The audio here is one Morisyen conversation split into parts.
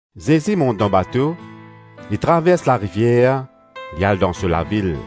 Zezi mont dan bato, li travers larivier, li al dan so lavil.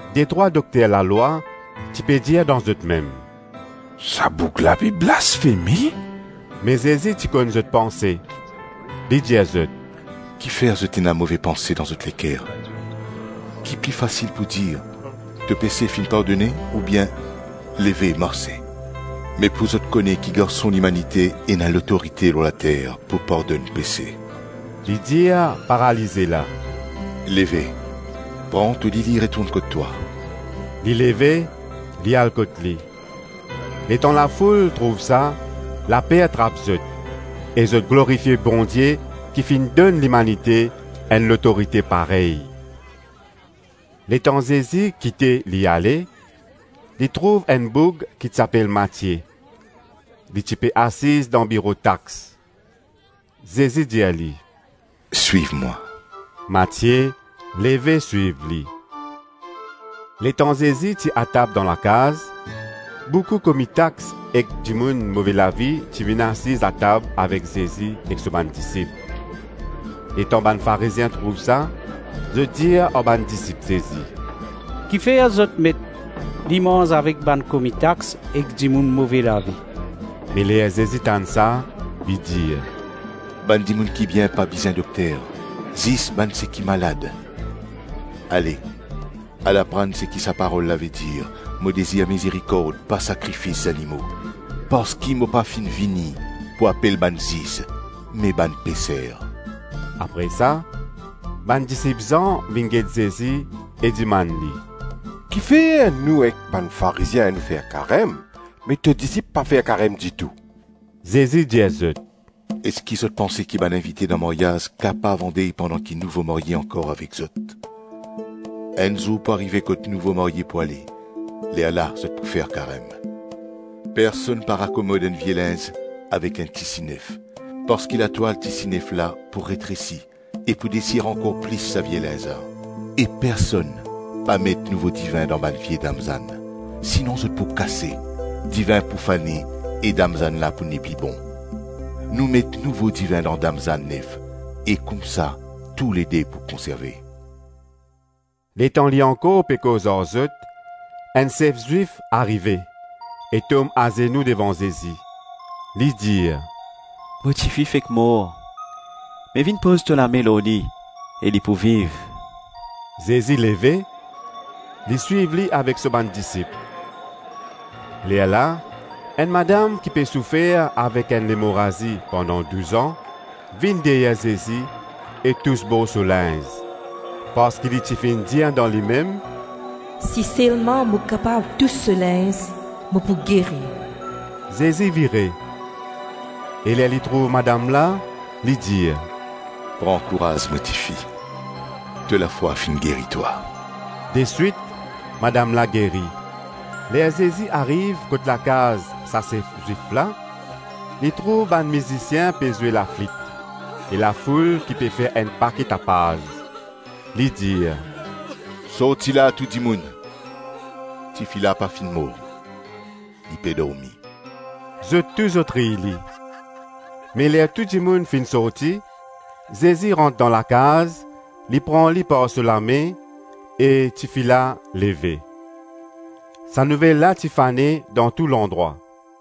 Detrwa dokter lalwa ti pe dir dan zotmem, “Sa boug la pe blasfeme.” Me Zezi ti konn zot panse, li dir zot, “Kifer zot ena move panse dan zot leker? Ki pli fasil pou dir, ‘To pese finn pardone,’ oubien ‘Leve, marse’? Me pou zot kone ki Garson Limanite ena lotorite lor later pou pardonn pese,” Li dir paralize la, “Leve, pran to lili retourn kot twa.” Li leve, li al kot li. Letan lafoul trouv sa, laper trap zot, e zot glorifie Bondie ki finn donn limanite enn lotorite parey. Letan Zezi kite li ale, li trouv enn boug ki ti apel Matie, li ti pe asiz dan biro tax. Zezi dir li, “Swiv mwa.” Matie leve swiv li. Letan Zezi ti atab dan lakaz, boukou komi tax ek dimoun move lavi ti vinn asiz atab avek Zezi ek so bann disip Letan bann Farizien trouv sa, zot dir ar bann disip Zezi, “Kifer zot Met, li manz avek bann komi tax ek dimoun move lavi?” Me ler Zezi tann sa li dir, “Bann dimoun ki bien pa bizin dokter, zis bann seki malad. Ale, al aprann seki sa parol la vedir, ‘Mo dezir mizerikord, pa sakrifis zanimo. Parski mo pa finn vini pou apel bann zis me bann peser.’” Apre sa, bann disip Zan vinn get Zezi e dimann li, “Kifer nou ek bann Farizien, nou fer karem, me to disip pa fer karem ditou?” Zezi dir zot, “Eski zot panse ki bann invite dan maryaz kapav andey pandan ki nouvo marye ankor avek zot? Enn zour pou arive kot nouvo marye pou ale, lerla zot pou fer karem. Personn pa rakomod enn vie linz avek enn tisi nef; parski latwal tisi nef la pou retresi e pou desir ankor plis sa vie linz la. E personn pa met nouvo divin dan bann vie damzann, sinon zot pou kase, divin pou fane e damzann la pou nepli bon. Nou met nouvo divin dan damzann nef e koumsa toulede pou konserve.” Letan li ankor pe koz ar zot, enn sef Zwif arive e tom azenou devan Zezi, li dir, “Mo tifi fek mor, me vinn poz to lame lor li e li pou viv.” Zezi leve, li swiv li avek so bann disip. Lerla enn madam ki pe soufer avek enn lemorazi pandan douz-an, vinn deryer Zezi e tous bor so linz, parski li ti finn dir dan limem, “Si selman mo kapav tous so linz, mo pou geri.” Zezi vire, e ler li trouv madam la, li dir, “Pran kouraz mo tifi, to lafwa finn geri twa.” Deswit madam la geri. Ler Zezi ariv kot lakaz sa sef Zwif la, li trouv bann mizisien pe zwe laflit e lafoul ki pe fer enn pake tapaz. Li dir, “Sorti la tou dimoun, tifi la pa finn mor, li pe dormi”. Zot tou zot riy li. Me ler tou dimoun finn sorti, Zezi rant dan lakaz, li pran li par so lame e tifi la leve. Sa nouvel la ti fane dan tou landrwa.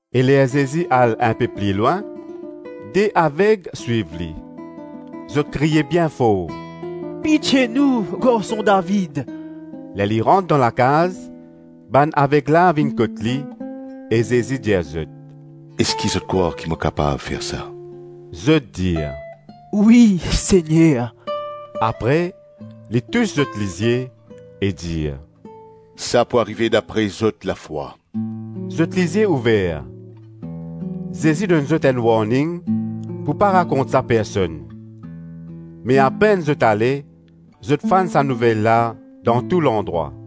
E ler Zezi al inpe pli lwin, de aveg swiv li, zot kriye bien for, “Pitie nou, garson David” Ler li rant dan lakaz, bann aveg la vinn kot li e Zezi dir zot, “Eski zot krwar ki mo kapav fer sa?” Zot dir, “Wi Segner.” Apre li tous zot lizie, e dir, “Sa pou arive dapre zot lafwa.” Zot lizie ouver. Zezi donn zot enn warning pou pa rakont sa personn. Me apenn zot ale, zot fann sa nouvel la dan tou landrwa.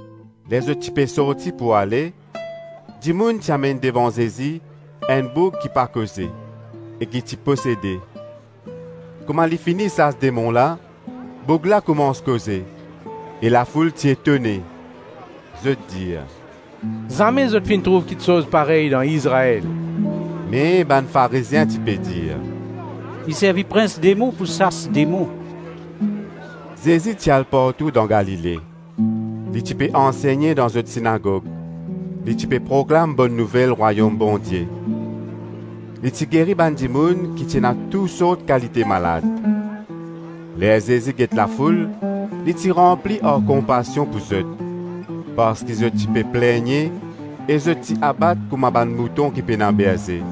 Ler zot ti pe sorti pou ale, dimoun ti amenn devan Zezi enn boug ki pa koze e ki ti posede. Kouma li fini sas demon la, boug la koumans koze e lafoul ti etone, zot dir, “Zame zot finn trouv kiksoz parey dan Izrael.” Me bann Farizien ti pe dir, “Li servi prins demon pou sas demon.” Zezi ti al partou dan Galile, li ti pe ansegne dan zot sinagog, li ti pe proklam Bonn Nouvel Rwayom Bondie. Li ti geri bann dimoun ki ti ena tousort kalite malad. Ler Zezi get lafoul, li ti ranpli ar konpasion pou zot, parski zot ti pe plegne e zot ti abat kouma bann mouton ki pena berze.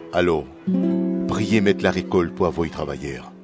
Alor, priye met larekolt pou avoy travayer”